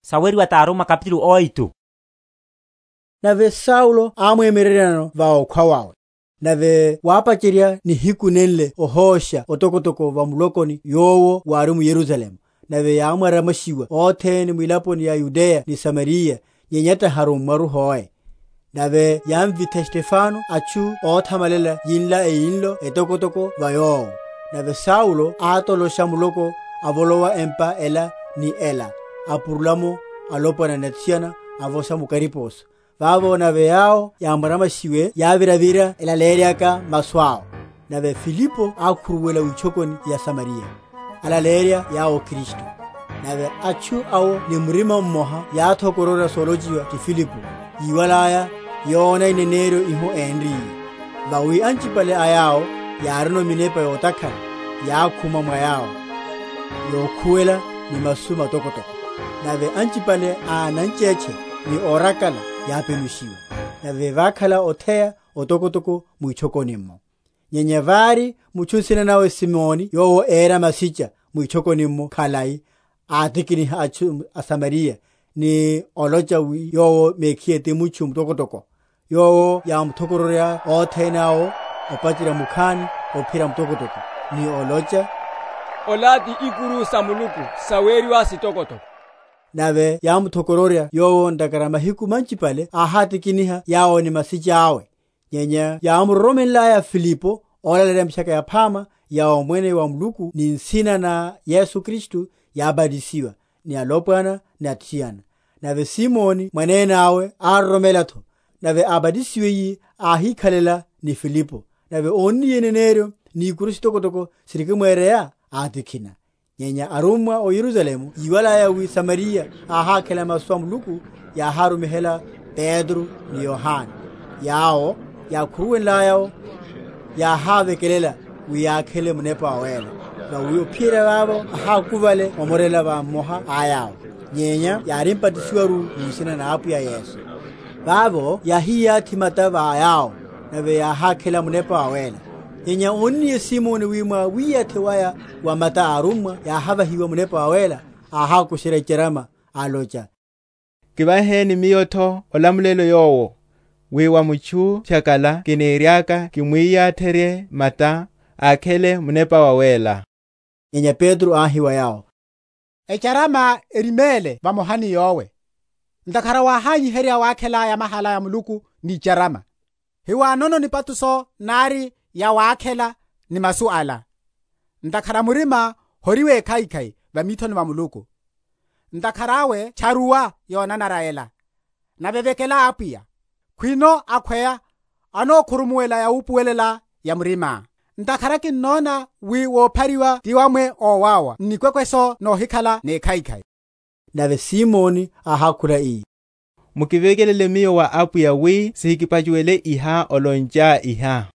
Mitchaka Yaphama va Samariya. Simoni awísachiherya. Nave Saulo ámwemyereryanano va okhwa wawe. Nave wápacherya nihiku nenle ohósha otokotoko va mulokoni yowo wári m’Yerusalemu; nave yámwaramwashiwa othene mwilaponi sa Yudeya ni Samariya, nyenya tahi arummwa hoe. Nave yámvitha Stefano atchu óthamalela yinla eyinlo etokotoko va yowo. Nave Saulo átolosha muloko, avolowa empa ela ni’la, apurula’mo alopwana ni athiana, ávosha mu kariposo. Vavo nave yawo yámwaramwashiwe yáviravira elaleyeryaka masu awo. Nave Filipo ákhuruwela witchokoni ya Samariya, alaleyerya yawo Kristu. Nave atchu awo ni murima mmoha yáthokororya solochiwa ti Filipo, yíwalaya, yóna ineneryo hiho énriye. Vawi anchipale a yawo yárino minepa yotakhala, yákhuma mwa yawo, yokhuwela ni masu matokotoko: nave anchipale a nanchetche, ni órakala, yápenushiwa. Nave vákhala otheya otokotoko mwitchokoni’mmo. Nyenya vári mutchu nsina nawe Simoni yowo éra masicha mwitchokoni’mmo khalai, átikiniha atchu aSamariya, ni olocha wi yowo mekhiye ti mutchu mutokotoko: yowo yámuthokoronryaya othene awo, opacherya mukhani ophiyerya mutokwene, ni olocha, Ola ti ikuru sa Muluku, saweriwa Sitokotoko. Nave yámuthokororya yowo, ntakhara mahiku manchipale áhátikiniha yawo ni masicha awe. Nyenya yámuroromenlaya Filipo ólaleyerya mitchaka yaphama ya omwene wa Muluku ni nsina na Yesu Kristu, yábatisiwa, ni alopwana ni athiana. Nave Simoni mwanene awe ároromela’tho: nave ábatisiwiye, áhikhalela ni Filipo; nave ónniye ineneryo ni ikuru sitokotoko sirikimwereya, atikhina. Nyenya arummwa ó Yerusalemu yíwalaya wi Samariya áhákhela masu a Muluku, yáhárumihela Petro ni Yohane: yawo, yákhuruwenlaya’wo, yáhávekelela, wi yakhele Munepa Wawéla: vawi ophiyerya vavo ahákuvale omorela va mmoha a yawo: nyenya yárimbatisiwaru mu nsina na Apwiya Yesu. Vavo yáhiyathi mata va yawo, nave yáhákhela Munepa Wawéla. Nyenya ónniye Simoni wi mwa wiyathi waya wa mata a arummwa yáhavahiwa Munepa Wawéla, áhákusherya icharama, alocha, Kivaheni miyo’tho olamulelo yowo, wi va mutchu phyakala kiniriaka kimwiyatherye mata, ákhele Munepa Wawéla. Nyenya Petro áhi wa yowo, Echaramá eriméle vamoha ni yówe, ntakhara wáhányiherya wakhela yamahala ya Muluku ni icharama. Hiwanono nipatusho nari yawákhela ni masu ala: ntakhara murimá hori wekhaikhai va mithoni va Muluku. Ntakhara awe tcharuwa yonanara ela, nave vekela Apwiya, khwino akhweya anókhurumuwela yawupuwelela ya murimá. Ntakhara kinnona wi wophariwa ti wamwa ówáwa n’nikwekweso nohikhala nekhaikhai. Nave Simoni áhákhula ii, Mukivekelele miyo wa Apwiya wi sihikiphachuwele iha olonchá iha.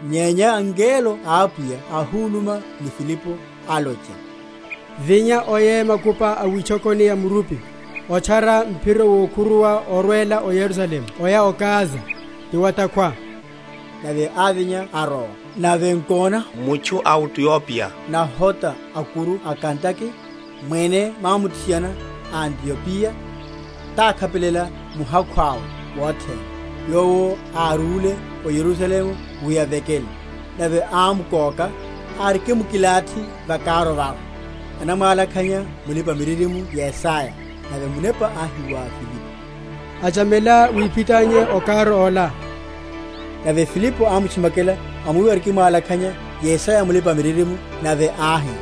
Nyenya ngelo a Apwiya áhúluma ni Filipo, alocha, Vinya, oye makupa a witchekuni ya murupi, otchara mphiro wokhuruwa orwela o Yerusalemu oya o Gaza: ti wa’takhwa. Nave ávinya arowa; nave nkona mutchu a o Aitiopiya nahota a’kuru a Kandake, mwene mwamuthiana a Aitiopiya, tákhapelela muhakhu awe wothene, yowo árúle o Yerusalemu wi avekele; nave ámkóka, arikimkilathi va karu awe, anamwalakhanya mulipa‐miririmo Yesaya. Nave Munepa áhi wa Filipo, Achamela, wiphitanye o karu ola. Nave Filipo ámtchimakela, amwiwa arikimwalakhanya Yesaya mulipa‐miririmo, nave áhi,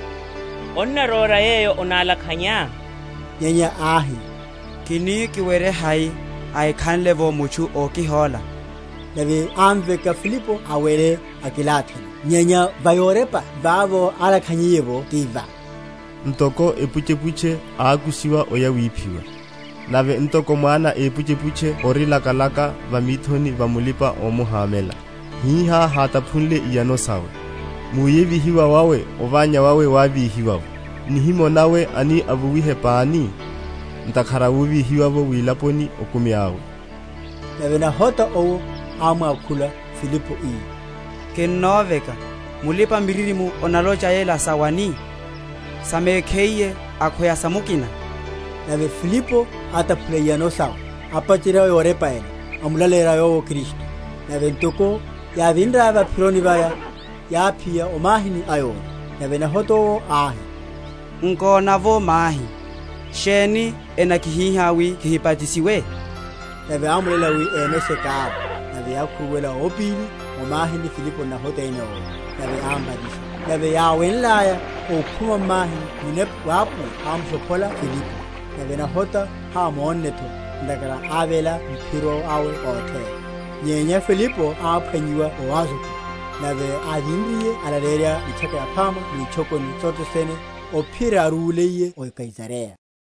Onnaróra yeyo onalakhanyá? Nyenya áhi, Kini kiwerye hai, ahikhanle’vo mutchu ókihóla? nave ámveka Filipo awele akilathino. Nyenya va yorepa vavo álakhanyiye’vo ti va, Ntoko epuchepuche ákushiwa oya wiphiwa, Nave ntoko mwana épuchepuche ori lakalaka va mithoni va mulipa‐omuhamela, Hiha hátaphunle iyano sawe: Mu’yevihiwa wawe ovanya wawe wávíhiwa’vo: Nihimo nawe ani avuwihe pani? Ntakhara wovíhiwa’wo wilaponi okumi awe. Nave nahota owo ámwákhula Filipo, ii, Kinnoveka, mulipa‐miririmo onalocha yela sa wani? sa mekhiye, akhweya sa mukina? Nave Filipo áthapula iyano sawe, apacherya yorepa ela, amlaleyerya yowo Kristu. Nave ntoko yáviraya va’phiro vaya, yáphiya o mahini ayori; nave nahota owo áhi, Nkona’vo mahi; sheni enakihíha wi kihibatisiwe? Nave ámuléla wi emeshe karu; nave yákhuruwela ópili o mahini, Filipo n’nahota ene owo; nave ámbatisa. Nave yáwenlaya okhuma m’mahini Munepa wa Apwiya ámushophola Filipo; nave nahota hámonne’tho, ntakhara ávéla m’phiro awe ótheya. Nyenya Filipo áphwanyiwa o Azotu: nave áviriye ánalaleyerya Mitchaka Yaphama mwitchokoni sothe sene, ophiyerya árúliye o Kaisareya.